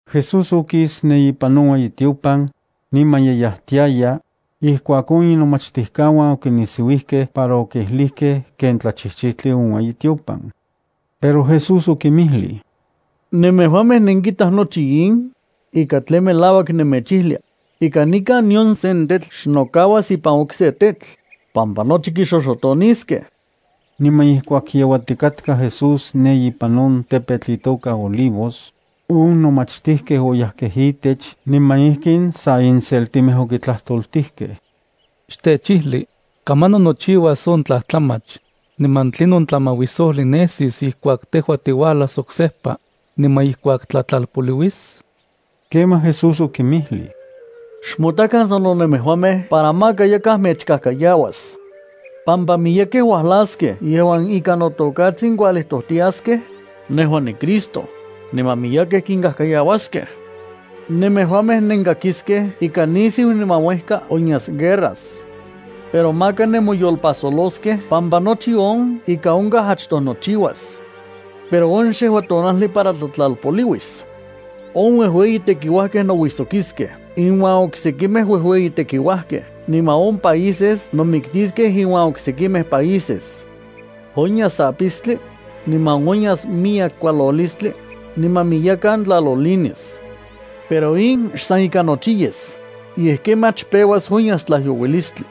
Jesús okis ne ipan on ueyitiopan, niman ye yajtiaya, ijkuak on inomachtijkauan okinisiuijkej para okijlijkej ken tlachijchijtli on ueyitiopan. Pero Jesús okinmijlij: —¿Nemejuamej nenkitaj nochi in? Ika tlen melauak nemechijlia, ika nikan nion sen tetl xnokauas ipan okse tetl, pampa nochi kixoxotoniskej. Niman ijkuak yeuatikatka Jesús ne ipan on tepetl itoka Olivos, on nomachtijkej oyajkej itech niman ijkin sa inseltimej okitlajtoltijkej: —Xtechijli, ¿kamanon nochiuas on tlajtlamach, niman tlinon tlamauisojli nesis ijkuak tejua tiuajlas oksejpa, niman ijkuak tlatlalpoliuis? Kemaj Jesús okinmijlij: —Xmotakan sano nemejuamej para maka yakaj mechkajkayauas, pampa miyekej uajlaskej yejuan ikan noTokatsin kualijtojtiaskej: “Nejua niCristo”, niman miyekej kinkajkayauaskej. Nemejuamej nenkakiskej ika nisiu niman uejka onyas guerras. Pero maka nemoyolpajsoloskej pampa nochi on ika onkaj achtoj nochiuas. Pero on xejua tonajli para tlatlalpoliuis. On uejueyitekiuajkej nouijsokiskej inuan oksekimej uejueyitekiuajkej niman on países nomiktiskej inuan oksekimej países. Onyas apistli, niman onyas miyek kualolistli, niman miyekan tlalolinis. Pero in xsan ika nochi yes, yej kemach peuas onyas tlajyouilistli.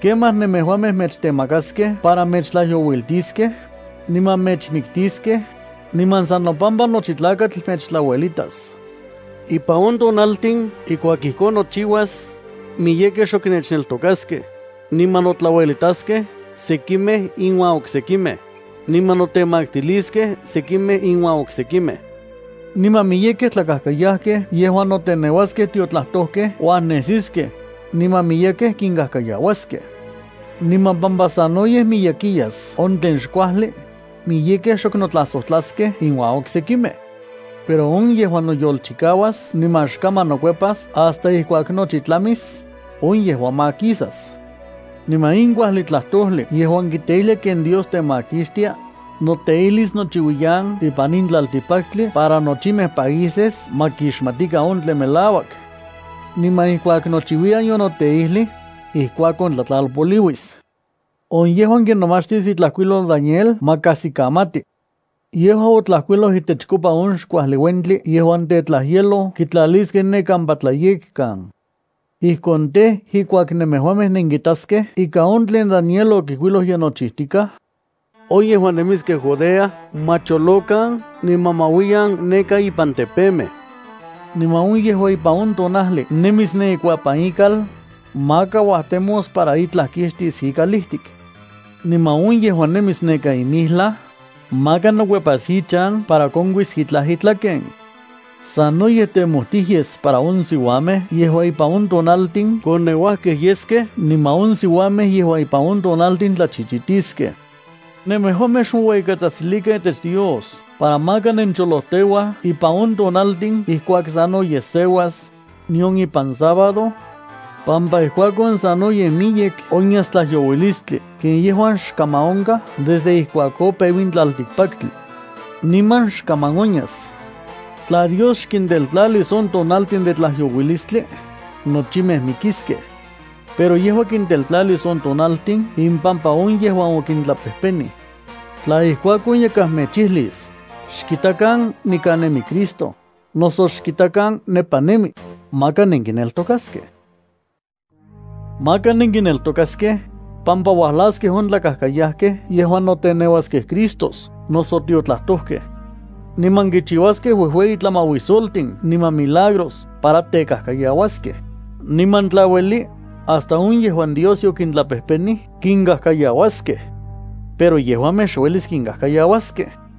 ’Kemaj nemejuamej mechtemakaskej para mechtlajyouiltiskej, niman mechmiktiskej, niman san nopampa nochi tlakatl mechtlauelitas. Ipan on tonaltin ijkuak ijkon nochiuas, miyekej xok nechneltokaskej, niman notlauelitaskej sekimej iuan oksekimej, niman notemaktiliskej sekimej iuan oksekimej. Niman miyekej tlakajkayajkej yejuan noteneuaskej tiotlajtojkej uajnesiskej, niman miyekej kinkajkayauaskej. Niman pampa sanoyej miyekiyas on tlen xkuajli, miyekej xok notlajsojtlaskej inuan oksekimej. Pero on yejuan noyolchikauas niman xkaman nokuepas hasta ijkuak nochi tlamis, on yejua makisas. Niman in kuajli tlajtojli yejuan kiteijlia ken Dios temakixtia, noteijlis nochiuiyan ipan in tlaltikpaktli para nochimej países ma kixmatikan on tlen melauak. Niman ijkuak nochiuiyan yonoteijlij, ijkuakon tlatlalpoliuis. ’On yejuan kinomachtis itlajkuilol Daniel ma kajsikamati. Yejua otlajkuiloj itechkopa on xkuajli uentli yejuan tetlajyeloj kitlaliskej ne kampa tlayekkan. Ijkon tej, ijkuak nemejuamej nenkitaskej ika on tlen Daniel okijkuiloj ye nochijtikaj, on yejuan nemiskej Judea ma cholokan niman ma uiyan neka ipan tepemej. Niman on yejuan ipan on tonajli nemis ne ikuapan ikal, maka uajtemos para itlaj kixtis ikalijtik. Niman on yejuan nemis neka ipan campo, maka nokuepas ichan para konkuis itlaj itlaken. ¡Sanoyej temojtij yes para on siuamej yejuan ipan on tonaltin koneuajkej yeskej niman on siuamej yejuan ipan on tonaltin tlachichitiskej! Nemejuamej xmoueyikatsajtsilikan itech Dios para maka nencholojteuaj ipan on tonaltin ijkuak sanoyej seuas, nion ipan sábado, pampa ijkuakon sanoyej miyek onyas tlajyouilistli ken yejuan xkaman onkaj desde ijkuak opeu in tlaltikpaktli, niman xkaman onyas. Tla Dios xkinteltlalis on tonaltin de tlajyouilistli, nochimej mikiskej. Pero yejua kinteltlalis on tonaltin impampa on yejuan yokintlapejpenij. ’Tla ijkuakon yakaj mechijlis: “Xkitakan, nikan nemi Cristo”, noso “Xkitakan, nepa nemi”, maka nenkineltokaskej. Maka nenkineltokaskej, pampa uajlaskej on tlakajkayajkej yejuan noteneuaskej Cristos noso tiotlajtojkej. Niman kichiuaskej uejueyi tlamauisoltin niman milagros para tekajkayauaskej, niman tla ueli, hasta on yejuan Dios yokintlapejpenij kinkajkayauaskej. Pero yejuamej xuelis kinkajkayauaskej.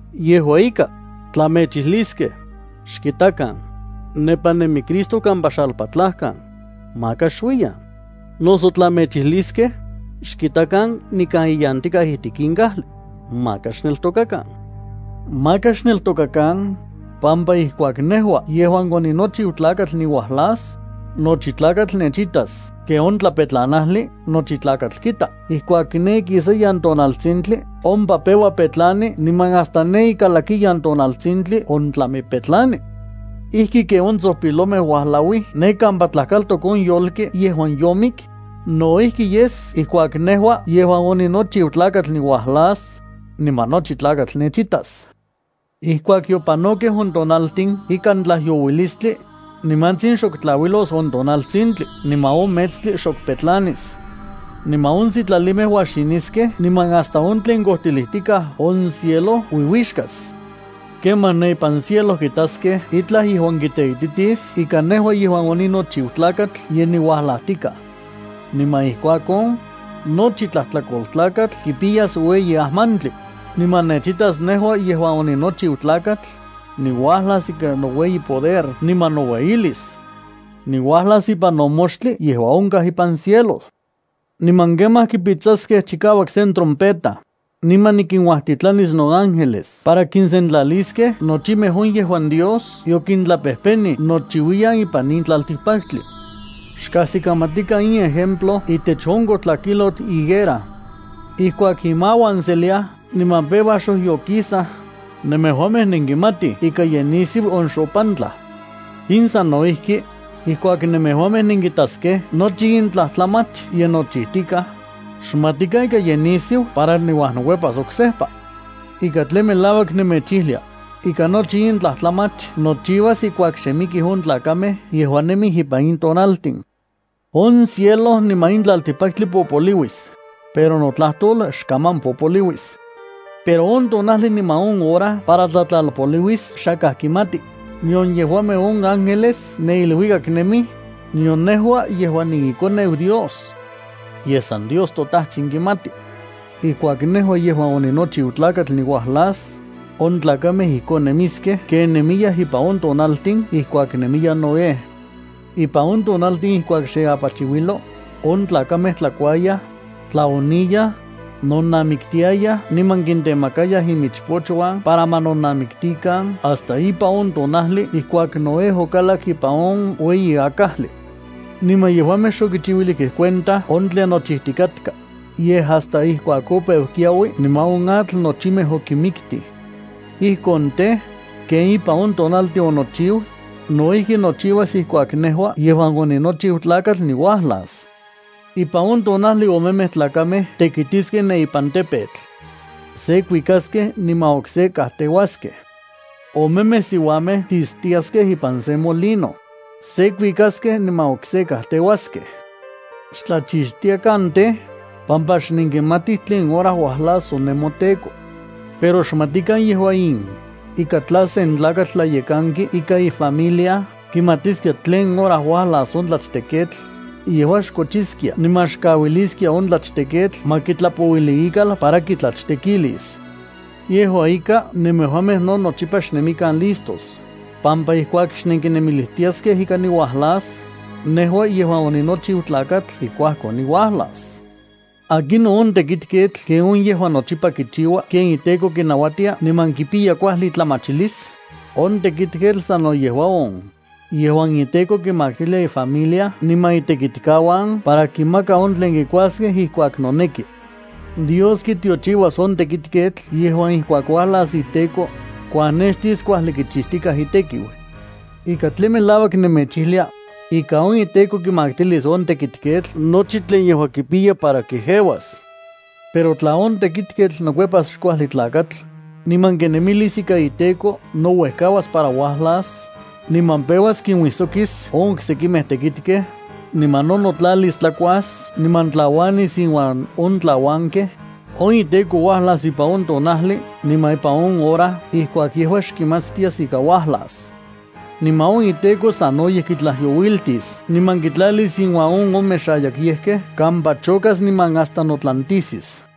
Yejua ika, tla mechijliskej: “Xkitakan, nepa nemi Cristo kampa xalpatlajkan”, maka xuiyan. Noso tla mechijliskej: “Xkitakan nikan iyantikaj ijtik in kajli”, maka xneltokakan. Maka xneltokakan, pampa ijkuak nejua yejuan oninochiu Tlakatl niuajlas, nochi tlakatl nechitas ken on tlapetlanajli nochi tlakatl kita ijkuak ne ikisayan tonaltsintli ompa peua petlani niman hasta ne ikalakiyan tonaltsintli ontlami petlani. ’Ijki ken on tsojpilomej uajlauij ne kampa tlajkaltok on yolki yejuan yomik, no ijki yes ijkuak nejua yejuan onichiu Tlakatl niualas, niman nochi tlakatl nechitas. ’Ijkuak yopanokej on tonaltin ikan tlajyouilistli, nimantsin xok tlauilos on tonaltsintli niman on metstli xok petlanis. Niman on sitlalimej uajxiniskej niman hasta on tlen kojtilijtikaj on cielo uiuixkas. Kemaj ne ipan cielo kitaskej itlaj yejuan kiteititis ika nejua yejuan oninochiu Tlakatl ye niuajlajtikaj. Niman ijkuakon, nochi tlajtlakoltlakatl kipiyas ueyi ajmantli, niman nechitas nejua yejuan oninochiu Tlakatl, niuajlas ikan noueyi poder niman noueyilis. Niuajlas ipan on moxtli yejuan onkaj ipan cielo. Niman kemaj kipitsaskej chikauak sen trompeta, niman nikinuajtitlanis noángeles para kinsentlaliskej nochimej on yejuan Dios yokintlapejpenij nochiuiyan ipan in tlaltikpaktli. ’Xkajsikamatikan in ejemplo itech on kojtlakijlotl higuera. Ijkuak imauan seliaj niman peuaj xojyokisaj, nemejuamej nenkimatij ika ye nisiu on xopantlaj. In sano ijki. Ijkuak nemejuamej nenkitaskej nochi in tlajtlamach ye nochijtikaj, xmatikan ika ye nisiu para niuajnokuepas oksejpa. Ika tlen melauak nemechijlia, ika nochi in tlajtlamach nochiuas ijkuak xe mikij on tlakamej yejuan nemij ipan in tonaltin. On cielo niman in tlaltikpaktli popoliuis, pero notlajtol xkaman popoliuis. ’Pero on tonajli niman on hora para tlatlalpoliuis xakaj kimati, nion yejuamej on ángeles ne iluikak nemij, nion nejua yejuan niiKoneu Dios. Yej san Dios toTajtsin kimati. ’Ijkuak nejua yejuan oninochiu Tlakatl niuajlas, on tlakamej ijkon nemiskej ken nemiyaj ipan on tonaltin ijkuak nemiya Noé. Ipan on tonaltin, ijkuak xe apachiuilo, on tlakamej tlakuayaj, tlaoniyaj, nonamiktiayaj niman kintemakayaj inmichpochuan para ma nonamiktikan hasta ipan on tonajli ijkuak Noé okalak ipan on ueyi akajli. Niman yejuamej xokichiuilijkej cuenta on tlen nochijtikatka, yej hasta ijkuak opeu kiaui niman on atl nochimej okinmiktij. Ijkon tej, ken ipan on tonaltin onochiu, no ijki nochiuas ijkuak nejua yejuan oninochiu Tlakatl niuajlas. Ipan on tonajli omemej tlakamej tekitiskej ipan campo. Se kuikaskej niman okse kajteuaskej. Omemej siuamej tistiaskej ipan sen molino. Se kuikaskej niman okse kajteuaskej. ’Xtlachixtiakan tej, pampa xnenkimatij tlen hora uajlas on nemoTEKO. Pero xmatikan yejua in, ika tla sen tlakatl tlayekanki ikan ifamilia kimatiskia tlen hora uajlas on tlachteketl, yejua xkochiskia niman xkauiliskia on tlachteketl ma kitlapouili ikal para kitlachtekilis. Yejua ika, nemejuamej no nochipa xnemikan listos, pampa ijkuak xnenkinemilijtiaskej ika niuajlas, nejua yejuan oninochiu Tlakatl ijkuakon niuajlas. ’¿Akinon on tekitketl ken on yejuan nochipa kichiua ken iteko kinauatia niman kipiya kuajli itlamachilis? On tekitketl sano yejua on, yejuan iteko kimaktilia ifamilia niman itekitkauan para kinmaka on tlen kikuaskej ijkuak noneki. Dios kitiochiuas on tekitketl yejuan ijkuak uajlas iteko, kuajnextis kuajli kichijtikaj itekiu. Ika tlen melauak nemechijlia, ika on iteko kimaktilis on tekitketl nochi tlen yejua kipiya para kejeuas. Pero tla on tekitketl nokuepas xkuajli tlakatl, niman kinemilis ika iteko nouejkauas para uajlas, niman peuas kinuijsokis on oksekimej tekitkej, niman no notlalis tlakuas niman tlauanis inuan on tlauankej, on iteko uajlas ipan on tonajli niman ipan on hora ijkuak yejua xkimatstias ika uajlas. Niman on iteko sanoyej kitlajyouiltis, niman kitlalis inuan on omexayakyejkej kampa chokas niman hasta notlantisis.